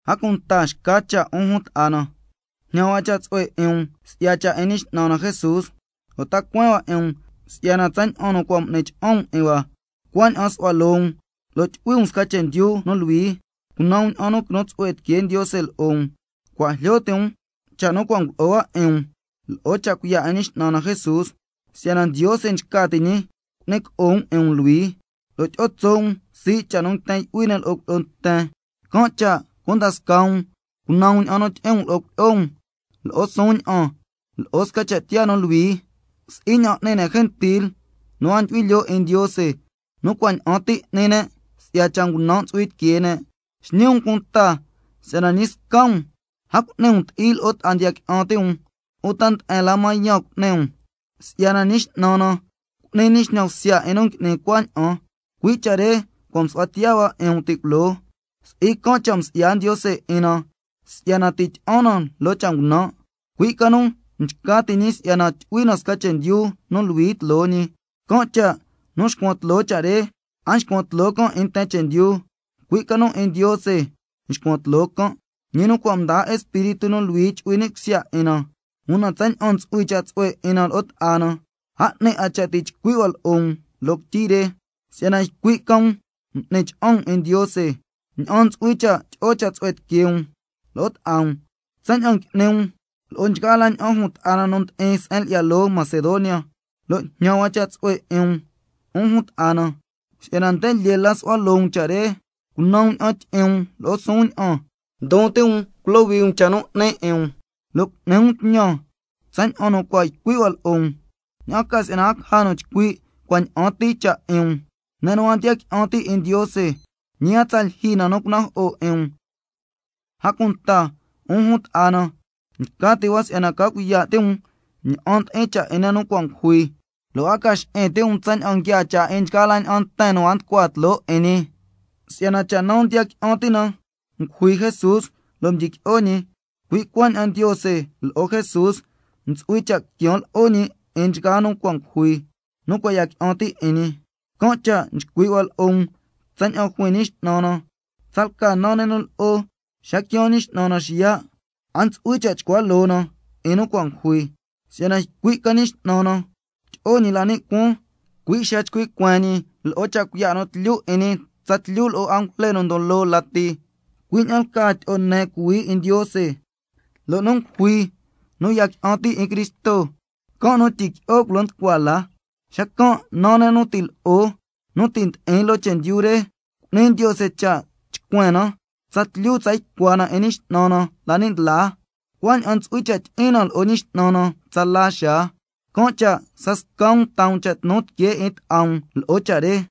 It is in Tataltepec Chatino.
A cunta xca cha', 'un jun ta'a na, jñan hua cha' tsu'hue 'in um si'ya cha' 'in Ñi X'nan na Jesús, lo' ta cueen hua 'in um si'yana tsaña'an nu cua' m'ni cha'an um 'in hua, cuaña'an su'hua loo um lo' tyu'hui um sca chendyu nu luhui, cunan um ña'an nu quinu tsu'hue tiquee Ndiose lo'o um. Cua' jlyo ti' um cha' nu cua' ngulo'o hua 'in um lo'o cha' cuiya' 'in Ñi X'nan na Jesús, si'yana Ndiose nchca ti' ñi cu'ni co'o um 'in um luhui, lo' tyi'o tso' um sii' cha' nu nguiten yu'hui ne' lo'o cuilyi'o nten. Can' cha' cunda scaa um cunan um ña'an nu tyi'in um lo'o cuilyi'o um lo'o suun ña'an, lo'o sca cha' tiyaa nu luhui, si'i ña'an n'ni ne' gentil nu a ndyu'hui lyoo 'in Ndiose, nu cua' ña'an ti n'ni ne' si'ya cha' ngunan' ntsu'hui tiquee ne'. Xñi um cunta si'yana ñi sca um a cu'ni um ti'i lo'o ta'a ndiya qui'an ti' um, uta nde'en la mañan cu'ni um, si'yana Ñi X'nan na cu'ni ñi xñan bsya 'in nu ngui'ni cuaña'an, cui' cha' re cua' msu'hua tiya hua 'in um ti' culoo. Si'i can' cha' msi'ya Ndiose 'in na si'yana ti' tyi'an na lo'o scasca cha' ngunan', cui' ca nu nchca ti' ñi si'yana tyu'hui na sca chendyu nu luhui tloo ñi. Can' cha' nu nxcuan tloo cha' re, a nxcuan tloo 'in nten chendyu, cui' ca nu 'in Ndiose nxcuan tloo can', ñi nu cua' mdaa Espíritu nu Luhui chu'hui ni' cusya 'in na. Una tsaña'an nu ntsu'hui cha' tsu'hue 'in na lo'o ta'a na, a 'ni 'a cha' ti' chcui' hua lo'o um loo quityi re, si'yana ycui' ca um m'ni cha'an um 'in Ndiose ña'an ntsu'hui cha' tyi'o cha' tsu'hue tiquee um lo'o ta'a um, tsaña'an ngui'ni um lo'o nchgaa la ña'an jun ta'a na nu ndi'in se'en lyi'ya loo Macedonia, lo' jñan hua cha' tsu'hue 'in um, 'un jun ta'a na, si'yana nde lyee la su'hua loo um cha' re. Cunan um ña'an tyi'in um lo'o suun ña'an, ndon ti' um culohui um cha' nu 'ni 'in um, lo' cu'ni um tñan tsaña'an nu cua' ycui' hua lo'o um, ña'an ca si'yana a caja nu chcui' cua' ña'an ti cha' 'in um, ne' nu a ndiya qui'an ti' 'in Ndiose, ñi a tsa lyijyi na nu cunajo'o 'in um. A cunta, 'un jun ta'a na, nchca ti' hua si'yana ca cuiya' ti' um ña'an ndi'in cha' 'in ne' nu cua' ngujui, lo' a ca xi'in ti' um tsaña'an nguiaa cha' 'in nchgaa la ña'an nten nu a nducua tloo 'in ñi. Si'yana cha' naa ndiya qui'an ti' na ngujui Jesús lo' mdyiqui'o ñi, cui' cuaña'an Ndiose lo'o Jesús ntsu'hui cha' quian lo'o ñi 'in nchgaa nu cua' ngujui, nu cua' ya qui'an ti' 'in ñi. Can' cha' chcui' hua lo'o um tsaña'an juin Ñi X'nan na: Tsalca naa ne' nu lo'o xa quiaan Ñi X'nan na xiya', a ntsu'hui cha' chcua loo na 'in nu cua' ngujui, si'yana ycui' ca Ñi X'nan na tyi'o ñi la ni' cuaan, cui' xa nchcui' cueen ñi lo'o cha' cuiya' nu tlyu 'in ñi tsatlyu lo'o angujle nu ndon loo lati, cui' ña'an lcaa tyi'o ne cuhuii 'in Ndiose, lo' nu ngujui nu ya qui'an ti' 'in Cristo, can' nu tyiqui'o culo nducua la, xacan' naa ne' nu lo'o nu ti' ndi'in loo chendyu re, cu'ni Ndiose cha' chcuen na, tsatlyu tsa ycua na 'in Ñi X'nan na la ni' ndlaa, cuaña'an ntsu'hui cha' tyi'in na lo'o Ñi X'nan na tsala xaa. Can' cha' scasca um taa um cha' tnu tiquee 'in ta'a um lo'o cha' re.